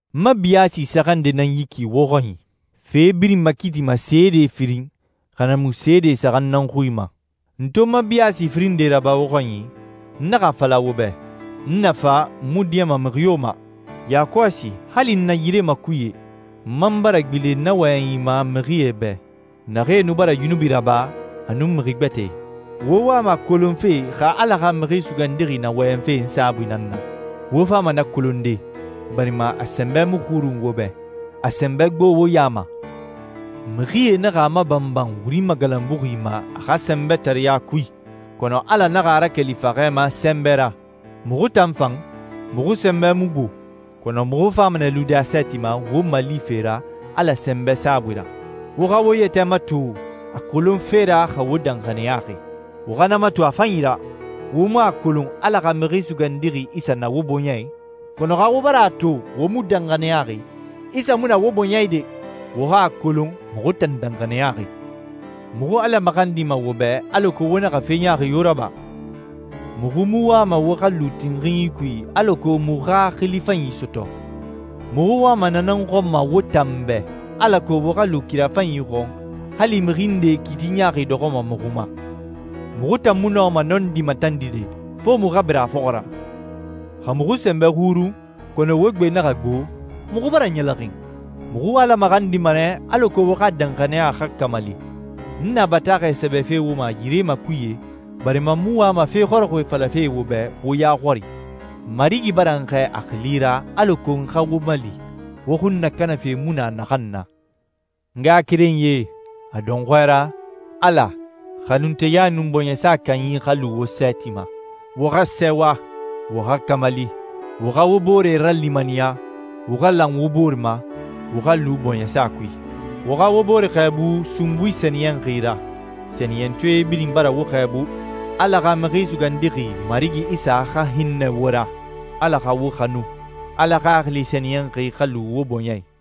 N ma biyaasi saxan nde nan yi ki wo xɔnyi. «Fe birin makiitima seede firin, xa na mu, seede saxan nan xui ma.» N to n ma biyaasi firin nde raba wo xɔnyi, n naxa a fala wo bɛ, «N na fa, n mu diɲɛma mixi yo ma.» Yakɔsi, hali n na yire makuye, n man bara gbilen na wɔyɛnyi ma mixie bɛ, naxee nu bara yunubi raba, a nun mixi gbɛtɛe. Wo wama a kolonfe xa Ala xa Mixi Sugandixi na wɔyɛnfe n saabui nan na. Wo fama na kolonde, barima a sɛnbɛ mu xurun wo bɛ. A sɛnbɛ gbo wo ya ma. Mixie naxa a mabanban wuri magalanbuxi ma a xa sɛnbɛtareya kui, kɔnɔ Ala naxa a rakeli faxɛ ma sɛnbɛ ra. Muxu tan fan, muxu sɛnbɛ mu gbo, kɔnɔ muxu fama nɛ lude a sɛɛti ma wo malife ra Ala sɛnbɛ saabui ra. Wo xa wo yɛtɛ mato a kolonfe ra xa wo danxaniyaxi. Wo xa na mato a fanyi ra. Wo mu a kolon Ala xa Mixi Sugandixi Isa na wo bɔɲɛ i? Kɔnɔ xa wo bara a to wo mu danxaniyaxi, Isa mu na wo bɔɲɛ i de! Wo xa a kolon muxu tan danxaniyaxi. Muxu Ala maxandima wo bɛ alako wo naxa fe ɲaaxi yo raba. Muxu mu wama wo xa lu tinxinyi kui alako muxu xa xili fanyi sɔtɔ. Muxu wama na nan xɔn wo tan bɛ, alako wo xa lu kira fanyi xɔn, hali mixi nde kiiti ɲaaxi dɔxɔma muxu ma. Muxu tan mu nɔma nɔndi matandide, fo muxu xa bira a fɔxɔ ra. Xa muxu sɛnbɛ xurun, kɔnɔ wo gbe naxa gbo, muxu bara ɲɛlɛxin. Muxu Ala maxandima nɛ alako wo xa danxaniya xa kamali. N na bataaxɛ sɛbɛfe wo ma yire makuye barima n mu wama fe xɔrɔxɔɛ falafe wo bɛ wo ya xɔri. Marigi bara n xɛɛ a xili ra alako n xa wo mali, wo xun nakanafe mu na naxan na. N ngaxakerenyie, a dɔnxɔɛ ra, Ala, xanunteya nun bɔɲɛsa kanyi xa lu wo sɛɛti ma, wo xa sɛɛwa, wo xa kamali, wo xa wo bore ralimaniya, wo xa lan wo bore ma, wo xa lu bɔɲɛsa kui. Wo xa wo bore xɛɛbu sunbui sɛniyɛnxi ra. Sɛniyɛntɔɛ birin bara wo xɛɛbu. Ala xa Mixi Sugandixi Marigi Isa xa hinnɛ wo ra, Ala xa wo xanu, Ala Xaxili Sɛniyɛnxi xa lu wo bɔɲɛ i.